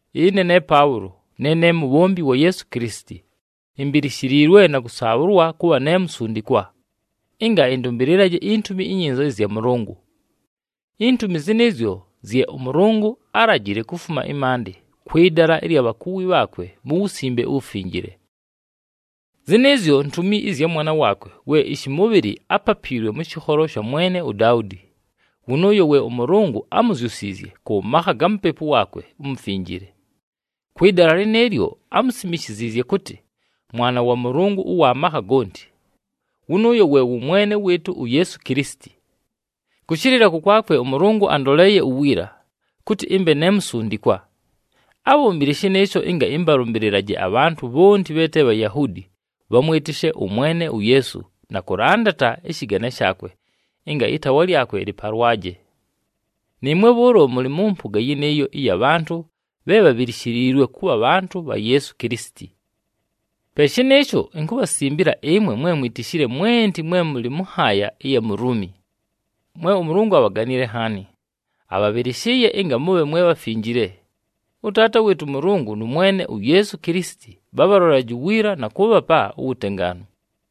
Ɨne ne Paʉlo, ne ne mubhombi wa Yeesu Kilisiti. Imbilishiliilwe na kʉsaabhʉlwa kʉbha ne musundikwa, ɨnga ɨndʉmbɨlɨlaje iNtumi iNyinza ɨzya Mʉlʉngʉ. Intumi zɨnɨɨzyo, zye ʉMʉlʉngʉ álajile kufuma ɨmaandɨ, kwɨ dala ɨlya bhakuwi bhaakwe mu Wusimbe uWufinjile. Zɨnɨɨzyo ntumi ɨzya Mwana waakwe we ɨshɨmʉbhɨlɨ ápapiilwe mʉ shɨkholo sha mwene uDaudi. Wʉnʉʉyo we ʉMʉlʉngʉ ámuzyusiizye, kʉ makha ga Mupepu waakwe uMufinjile. Kwɨ dala lɨnɨɨlyo, ámusimishiziizye kʉtɨ Mwana wa Mʉlʉngʉ ʉwa makha gonti. Wʉnʉʉyo we wʉ Mwene wɨɨtʉ uYeesu Kilisiti. Kʉshɨlɨla kʉkwakwe, ʉMʉlʉngʉ andoleeye uwiila, kʉtɨ ɨmbe ne musundikwa. Ábhombile shɨnɨɨsho ɨnga ɨmbalʉmbɨlɨlaje abhantʉ bhonti bhe te Bhayahuudi, bhamwɨtɨshe ʉMwene uYeesu na kʉlandata ɨshɨgane shaakwe ɨnga ɨtaawa lyakwe lɨpalwaje. Nɨɨmwe bhʉʉlo mʉlɨ mʉ mpʉga yɨnɨɨyo ɨya bhantʉ bhe bhabhilishiliilwe kʉbha bhantʉ bha Yeesu Kilisiti. Pe shɨnɨɨsho, inkubhasimbila ɨmwe mwe mwitishile mwenti mwe mʉlɨ mʉ nhaaya ɨya mu Luumi, mwe ʉMʉlʉngʉ abhaganile nhaani, abhabhɨlɨshɨɨye ɨnga mʉbhe mwe bhafinjile. ɄTaata wɨɨtʉ ʉMʉlʉngʉ nʉ Mwene uYeesu Kilisiti bhabhalolelaje uwiila na kʉʉbhapa uwutengaanu.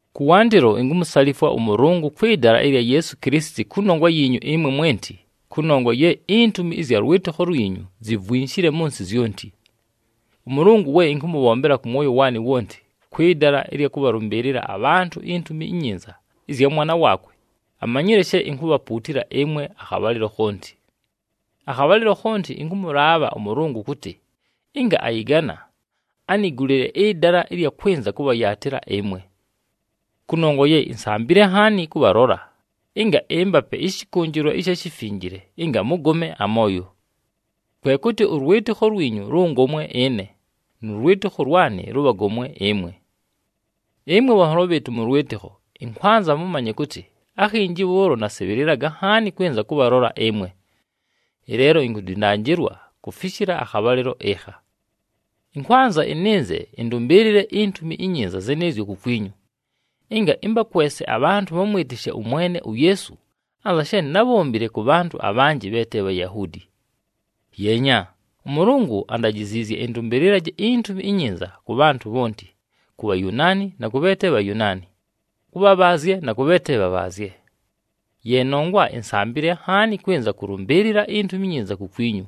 Kʉwandɨlo, inkumusalifwa ʉMʉlʉngʉ kwɨ dala ɨlya Yeesu Kilisiti kʉnongwa yiinyu ɨmwe mwenti, kʉnongwa ye intumi ɨzya lwɨtɨkho lwinyu zivwinshile mʉ nsɨ zyonti. ɄMʉlʉngʉ we ɨnkʉmʉbhombela kʉ mwoyo waanɨ wonti, kwɨ dala ɨlya kʉbhalʉmbɨɨlɨla abhantʉ iNtumi iNyinza ɨzya Mwana waakwe, amanyile she inkubhapuutila ɨmwe akhabhalɨlo khonti. Akhabhalɨlo khonti ɨnkʉmʉlaabha ʉMʉlʉngʉ kʉtɨ, ɨnga ayɨgana, anigulile ɨdala ɨlya kwɨnza kʉbhayaatɨla ɨmwe. Kʉnongwa ye insambile nhaani kʉbhalola, ɨnga ɨmbape ɨshɨkʉnjɨlwa ɨsha shifinjile ɨnga mʉgome amooyo. Kwe kʉtɨ, ʉlwɨtɨkho lwinyu lʉngomwe ɨne, nʉ lwɨtɨkho lwanɨ lʉbhagomwe ɨmwe. Ɨmwe bhanholo bhɨɨtʉ mʉ lwɨtɨkho, ɨnkwanza mʉmanye kʉtɨ, akhinji bhʉʉlo nasɨbhɨlɨlaga nhaani kwɨnza kʉbhalola ɨmwe. Ɨleelo, inkudindanjilwa kufishila akhabhalɨlo ɨkha. Ɨnkwanza ɨnɨnze ɨndʉmbɨɨlɨle iNtumi iNyinza zɨnɨɨzyo kukwinyu, ɨnga ɨmbakwese abhantʉ bhamwɨtɨshe ʉMwene uYeesu, anza she nábhombile kʉ bhantʉ abhanjɨ bhe te Bhayahuudi. Yeenya, ʉMʉlʉngʉ andajiziizye ɨndʉmbɨlɨlaje iNtumi iNyinza kʉ bhantʉ bhonti, ku Bhayunaani na kʉ bhe te Bhayunaani, kʉ bhabhaazye na kʉ bhe te bhabhaazye. Ye nongwa insambile nhaani kwɨnza kʉlʉmbɨɨlɨla iNtumi iNyinza kukwinyu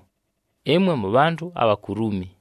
ɨmwe mʉbhantʉ abha ku Luumi.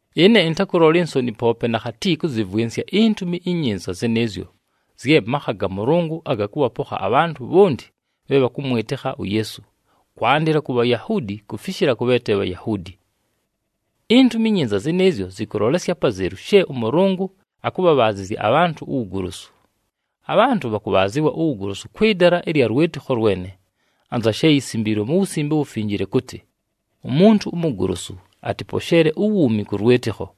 Ɨne ɨntakʉlola insoni poope nakhati kʉzɨvwɨnsya iNtumi iNyinza zɨnɨɨzyo zye makha ga Mʉlʉngʉ aga kʉbhapokha abhantʉ bhonti bhe bhakʉmwɨtɨkha uYeesu, kwandɨla ku Bhayahuudi kufishila kʉ bhe te Bhayahuudi. INtumi iNyinza zɨnɨɨzyo zɨkʉlolesya apazelu she ʉMʉlʉngʉ akʉbhabhaazɨzya abhantʉ uwugolosu. Abhantʉ bhakʉbhaazɨwa uwugolosu kwɨ dala ɨlya lwɨtɨkho lwene, anza she yisimbiilwe mu Wusimbe uWufinjile kʉtɨ, “Umuntu umugolosu atɨposheele uwuumi kʉ lwɨtɨkho.”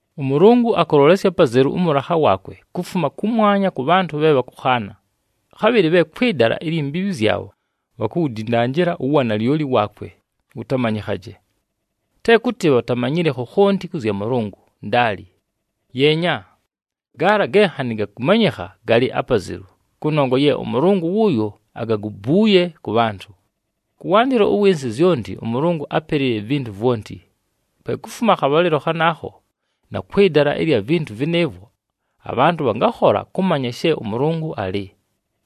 ɄMʉlʉngʉ akʉlolesya apazelu ʉmʉlakha waakwe kufuma kʉmwanya kʉ bhantʉ bhe bhakʉkhaana, khabhɨlɨ bhe kwɨ dala ilyi mbiibhi zyabho, bhakuwudindanjila uwanalyoli waakwe wʉtamanyɨkhaje. Te kʉtɨ bhatamanyile khokhonti kʉ zya Mʉlʉngʉ, ndaali. Yeenya, gaala ge nhanɨ gakʉmanyɨkha galɨ apazelu, kʉnongwa ye ʉMʉlʉngʉ wʉʉyo agagubuuye kʉ bhantʉ. Kʉwandɨlo ʉwɨ nsɨ zyonti, ʉMʉlʉngʉ ápelile ivintu vwonti. Pe kufuma akhabhalɨlo khanaakho na kwɨ dala ɨlya vintu vɨnɨɨvwo, abhantʉ bhangakhola kʉmanya she ʉMʉlʉngʉ alɨ,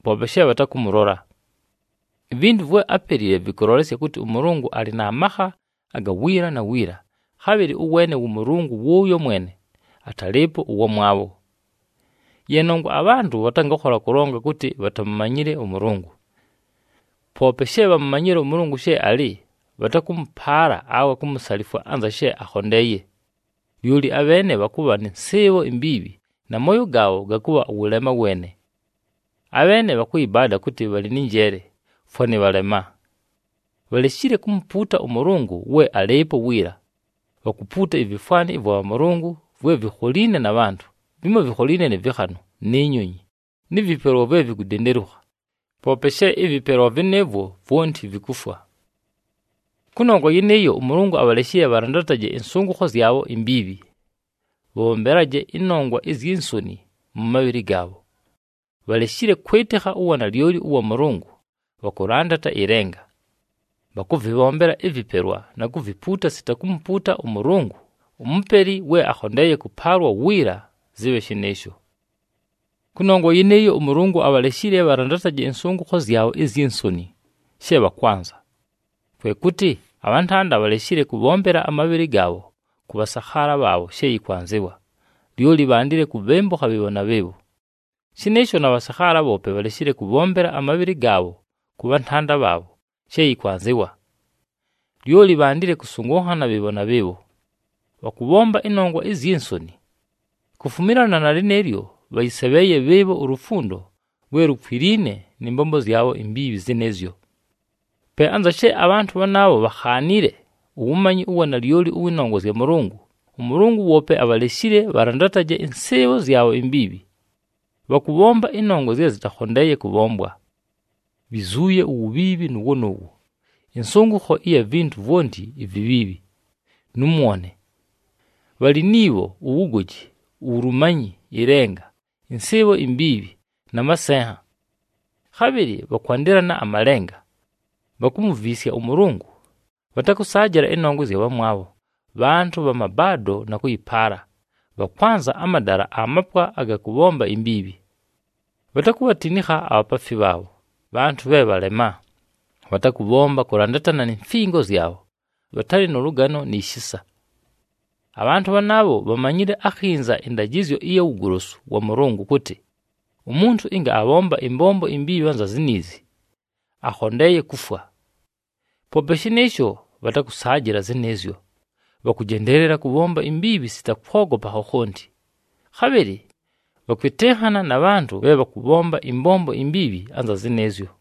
poope she bhatakʉmʉlola. Ivintu vwe ápelile vɨkʉlolesya kʉtɨ ʉMʉlʉngʉ alɨ na makha aga wiila na wiila, khabhɨlɨ ʉweene wʉ Mʉlʉngʉ wʉʉyo mwene, atalɨɨpo ʉwamwabho. Ye nongwa abhantʉ bhatangakhola kʉlonga kʉtɨ bhatamumanyile ʉMʉlʉngʉ. Poope she bhamumanyile ʉMʉlʉngʉ she alɨ, bhatakʉmʉpaala awe kumusalifwa anza she akhondeeye. Lyoli abheene bhakʉbha nɨ nsɨɨbho imbiibhi, na mooyo gaabho gakʉbha wʉlema weene. Abheene bhakʉyɨbaada kʉtɨ bhalɨ nɨ njeele, fwanɨ bhalema. Bhaleshile kumupuuta ʉMʉlʉngʉ we alɨɨpo wiila, bhakupuuta ivifwani ɨvwa bhamʉlʉngʉ vwe vikholiine na bhantʉ, vimo vikholiine nɨ vɨkhanʉ, ni nyonyi, nɨ vɨpelwa vwe vikudendelukha, poope she ɨvɨpelwa vɨnɨɨvwo vwonti vikufwa. Kʉnongwa yɨnɨɨyo, ʉMʉlʉngʉ abhaleshile bhalandataje ɨnsʉngʉkho zyabho imbiibhi, bhabhombelaje ɨnongwa izyi nsoni mʉ mabhɨlɨ gaabho. Bhaleshile kwɨtɨkha uwanalyoli ʉwa Mʉlʉngʉ, bhakʉlandata ɨlenga. Bhakʉvɨbhombela ɨvɨpelwa na kuvipuuta sita kumupuuta ʉMʉlʉngʉ, uMupeli we akhondeeye kʉpaalwa wiila! Zɨbhe shɨnɨɨsho. Kʉnongwa yɨnɨɨyo, ʉMʉlʉngʉ abhaleshile bhalandataje ɨnsʉngʉkho zyabho izyi nsoni, she bhakwanza. Kwe kʉtɨ, abhantanda bhaleshile kʉbhombela amabhɨlɨ gaabho kʉ bhasakhaala bhaabho she yɨkwanzɨwa. Lyoli bhandile kubhembukha bhɨɨbho na bhɨɨbho. Shɨnɨɨsho na bhasakhaala bhoope, bhaleshile kʉbhombela amabhɨlɨ gaabho kʉ bhantanda bhaabho she yɨkwanzɨwa. Lyoli bhandile kʉsʉngʉnhana bhɨɨbho na bhɨɨbho. Bhakʉbhomba ɨnongwa izyi nsoni. Kufumilana na lɨnɨɨlyo, bhayɨsebheeye bhɨɨbho ulufundo lwe lukwiliine nɨ mbombo zyabho imbiibhi zɨnɨɨzyo. Pe anza she abhantʉ bhanaabho bhakhaanile uwumanyi ʉwa nalyoli ʉwɨ nongwa zya Mʉlʉngʉ, ʉMʉlʉngʉ woope abhaleshile bhalandataje ɨnsɨɨbho zyabho imbiibhi. Bhakʉbhomba ɨnongwa zye zɨtakhondeeye kʉbhombwa. Bhizuuye uwubhiibhi nʉʉwo nʉʉwo, ɨnsʉngʉkho ɨya vintu vwonti ivibhiibhi, nʉ mwone. Bhalɨ ni bho, uwugoji, uwulumanyi, ɨlenga, ɨnsɨɨbho imbiibhi, na masenha. Khabhɨlɨ bhakwandɨlana amalenga, bhakumuviisya ʉMʉlʉngʉ, bhatakʉsaajɨla ɨnongwa ɨzya bhamwabho, bhantʉ bha mabaado na kʉyɨpaala, bhakwanza amadala amapwa aga kʉbhomba imbiibhi. Bhatakubhatinikha abhapaafi bhaabho, bhantʉ bhe bhalema, bhatakʉbhomba kʉlandatana ni mfingo zyabho, bhatalɨ nʉ lʉgano ni shisa. Abhantʉ bhanaabho bhamanyile akhinza ɨndajɨzyo ɨya wugolosu wa Mʉlʉngʉ kʉtɨ, umuntu ɨnga abhomba ɨmbombo imbiibhi anza ziniizi, akhondeeye kufwa. Poope shɨnɨɨsho, bhatakʉsaajɨla zɨnɨɨzyo! Bhakʉjendeelela kʉbhomba imbiibhi sita kwogopa khokhonti, khabhɨlɨ bhakwɨtɨnhana na bhantʉ bhe bhakʉbhomba ɨmbombo imbiibhi anza zɨnɨɨzyo.